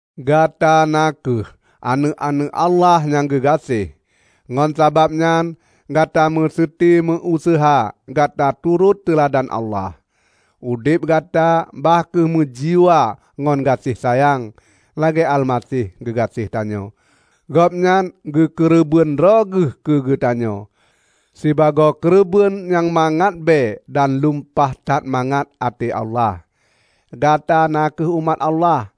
Gata na kheueh aneuëk-aneuëk Allah nyang geugaséh, ngon sabab nyan gata meuseuti meu-useuha gata turot teuladan Allah. Udeb gata bah kheueh meujiwa ngon gaséh sayang, lagée Almaseh geugaséh tanyoe. Gobnyan geukeureubeuen droe geuh keugeutanyoe, sibagoe keureubeuen nyang mangat bée dan lumpah that mangat até Allah. Gata na kheueh umat Allah.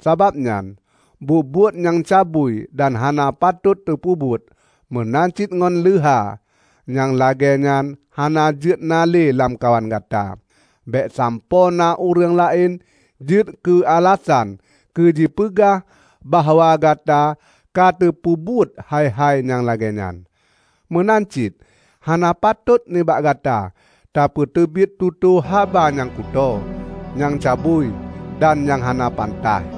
Sabab nyan, buet-buet nyang cabui dan hana patot teupeubuet, meunan cit ngon leuha, nyang lagée nyan hana jeuet na lamkawan gata. Bék sampoe na ureuëng laén jeuet keualasan keujipeugah bahwa gata katapeubuet hai-hai nyang lagée nyan. Meunan cit hana patot nibak gata tapeuteubiet tutoe haba nyang kutoe, nyang cabui dan nyang hana pantaih.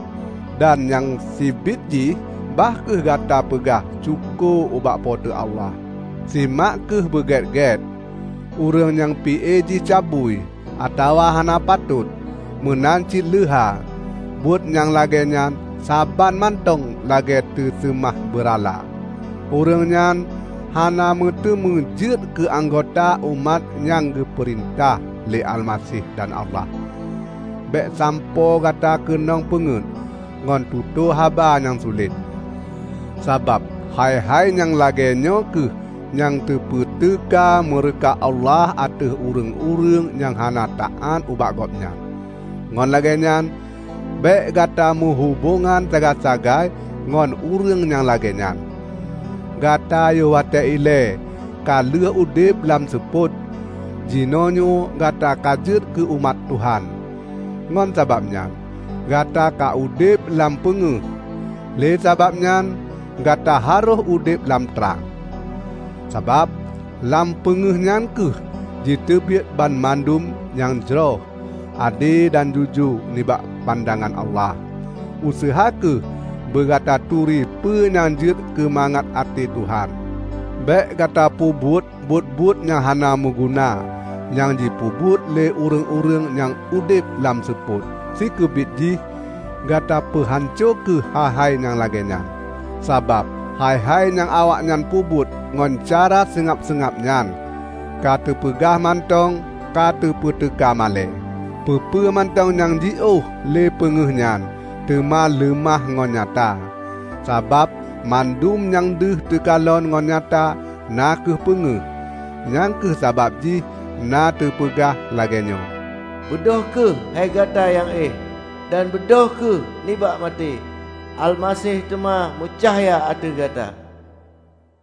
Dan nyang sibiet jih bah kheueh gata peugah syukoe ubak Po teu Allah. Simak kheueh beugét-gét: ureuëng nyang pi-e jih cabui, atawa hana patot, meunan cit leuha (buat nyang lagée nyan saban mantong lagée teuseumah beurala), ureuëng nyan hana meuteumé jeuet keu anggota umat nyang geupeurintah lé Almaseh dan Allah. Bék sampoe gata keunong peungét ngon tutoe haba nyang sulet. Sabab hai-hai nyang lagée nyoe kheueh nyang teupeuteuka meureuka Allah ateueh ureuëng-ureuëng nyang hana taát ubak Gobnyan. Ngon lagée nyan, bék gata meuhubongan sagai-sagai ngon ureuëng nyang lagée nyan. Gata yoh watée ilée ka lheueh udeb lam seupôt. Jinoenyoe gata ka jeuet keu umat Tuhan, ngon sababnyan gata ka udeb lam peungéh. Lé sababnyan gata harôh udeb lam trang. Sabab lam peungéh nyan kheueh jiteubiet banmandum nyang jroh, ade dan jujoe nibak pandangan Allah. Useuha kheueh beugata turi peue nyang jeuet keumangat até Tuhan. Bék gata peubuet buet-buet nyang hana meuguna nyang jipeubuet lé ureuëng-ureuëng nyang udeb lam seupôt. Sikeubiet jih, gata peuhanco kheueh hai-hai nyang lagée nyan. ( Sabab hai-hai nyang awaknyan peubuet ngon cara seungab-seungab nyan, keuteupeugah mantong ka teupeuteuka malée.) Peue-peue mantong nyang jilôh lé peungéh nyan, teuma leumah ngon nyata. Sabab mandum nyang deuh teukalon ngon nyata, na kheueh peungéh. Nyang kheueh sabab jih na teupeugah lagée nyoe, "Beudôh kheueh, hei gata nyang éh, dan beudôh kheueh nibak maté! Almaseh teuma meucahya ateueh gata."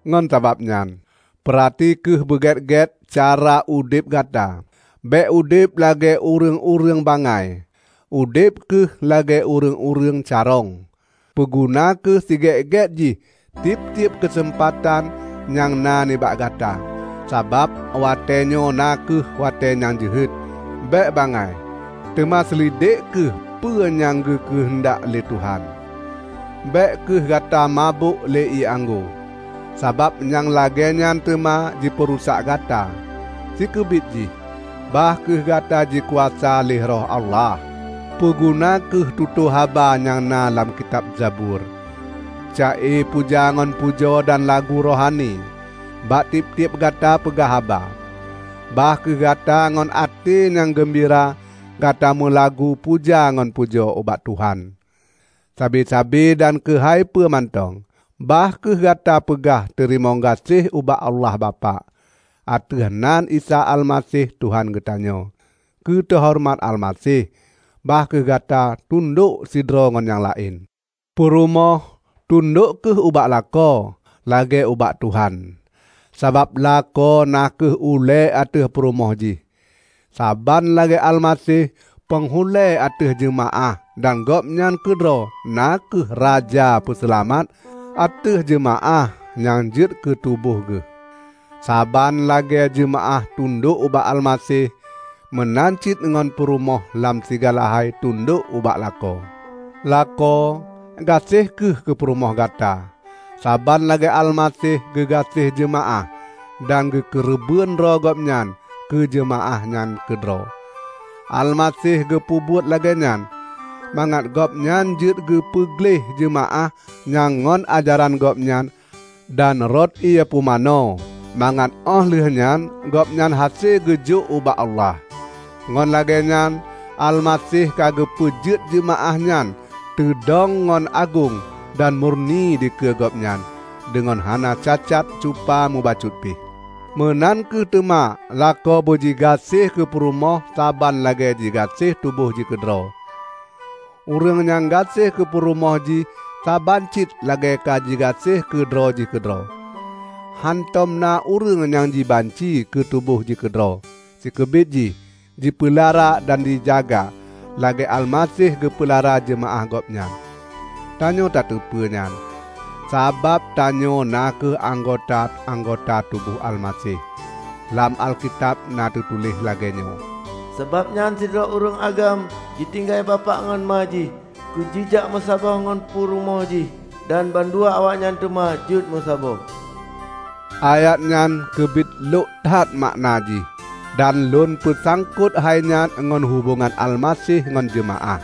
Ngon sabab nyan, peurati kheueh beugét-gét cara udeb gata. Bék udeb lagée ureuëng-ureuëng bangai; udeb kheueh lagée ureuëng-ureuëng carông. Peuguna kheueh sigét-gét jih tieb-tieb keuseumpatan nyang na nibak gata, sabab watéenyoe na kheueh watée nyang jeuhet. Bék bangai, teuma seulidek kheueh peue nyang geukeuheundak lé Tuhan. Bék kheueh gata mabök lé ié anggô, sabab nyang lagée nyan teuma jipeurusak gata. Sikeubiet jih, bah kheueh gata jikuasa lé Roh Allah. Peuguna kheueh tutoe haba nyang na lam kitab zabur, ca-e puja ngon pujoe dan lagu rohani, bak tieb-tieb gata peugah haba. Bah kheueh gata ngon até nyang geumbira gata meulagu puja ngon pujoe ubak Tuhan. Sabe-sabe dan keuhai peue mantong, bah kheueh gata peugah teurimong gaséh ubak Allah Bapak, ateueh nan Isa Almaseh Tuhan geutanyoe. Keu teuhoreumat Almaseh, bah kheueh gata tundok sidroe ngon nyang laén. Purumoh, tundok kheueh ubak lakoe, lagée ubak Tuhan. Sabab lakoe na kheueh ulée ateueh purumoh jih, saban lagée Almaseh panghulée ateueh jeumaáh dan Gobnyan keudroe na kheueh Raja Peuseulamat ateueh jeumaáh nyang jeuet keutuboh geuh. Saban lagée jeumaáh tundok ubak Almaseh, meunan cit ngon peurumoh lam sigala hai tundok ubak lakoe. Lakoe, gaséh kheueh keupurumoh gata, saban lagée Almaseh geugaséh jeumaáh dan geukeureubeuen droe Gobnyan keu jeumaáh nyan keudroe. Almaseh geupeubuet lagée nyan mangat Gobnyan jeuet geupeu gleh jeumaáh nyan ngon ajaran Gobnyan dan rot ié pumanö, mangat óh lheueh nyan Gobnyan hase geujok ubak Allah. Ngon lagée nyan Almaseh ka geupeujeuet jeumaáh nyan teudong ngon agong dan murni dikeue Gobnyan, deungon hana cacat cupa mubacut pih. Meunan kheueh teuma lakoe beujigaséh keupurumoh saban lagée jigaséh tuboh jih keudroe. Ureuëng nyang gaséh keupurumoh jih saban cit lagée ka jigaséh keu droe jih keudroe. ( Hántom na ureuëng nyang jibanci keu tuboh jih keudroe. Sikeubiet jih, jipeulara dan jijaga lagée Almaseh geupeulara jeumaáh Gobnyan. Tanyoe tateupeue nyan, sabab tanyoe na kheueh anggota-anggota tuboh Almaseh.) Lam Alkitab na teutuléh lagée nyoe, "Sabab nyan sidroe ureuëng agam jitinggai bapak ngon ma jih keujijak meusaboh ngon purumoh jih, dan bandua awaknyan teuma jeuet meusaboh." Ayat nyan keubiet lhok that makna jih. Dan lôn peusangkot hainyan ngon hubongan Almaseh ngon jeumaáh.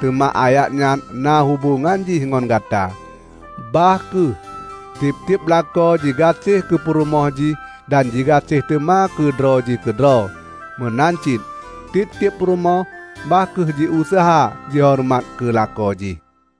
Teuma ayat nyan na hubongan jih ngon gata: Bah kheueh tieb-tieb lakoe jigaséh keupurumoh jih dan jigaséh teuma keu droe jih keudroe meunan cit tieb-tieb purumoh bah kheueh jiuseuha jihoreumat keu lakoe jih.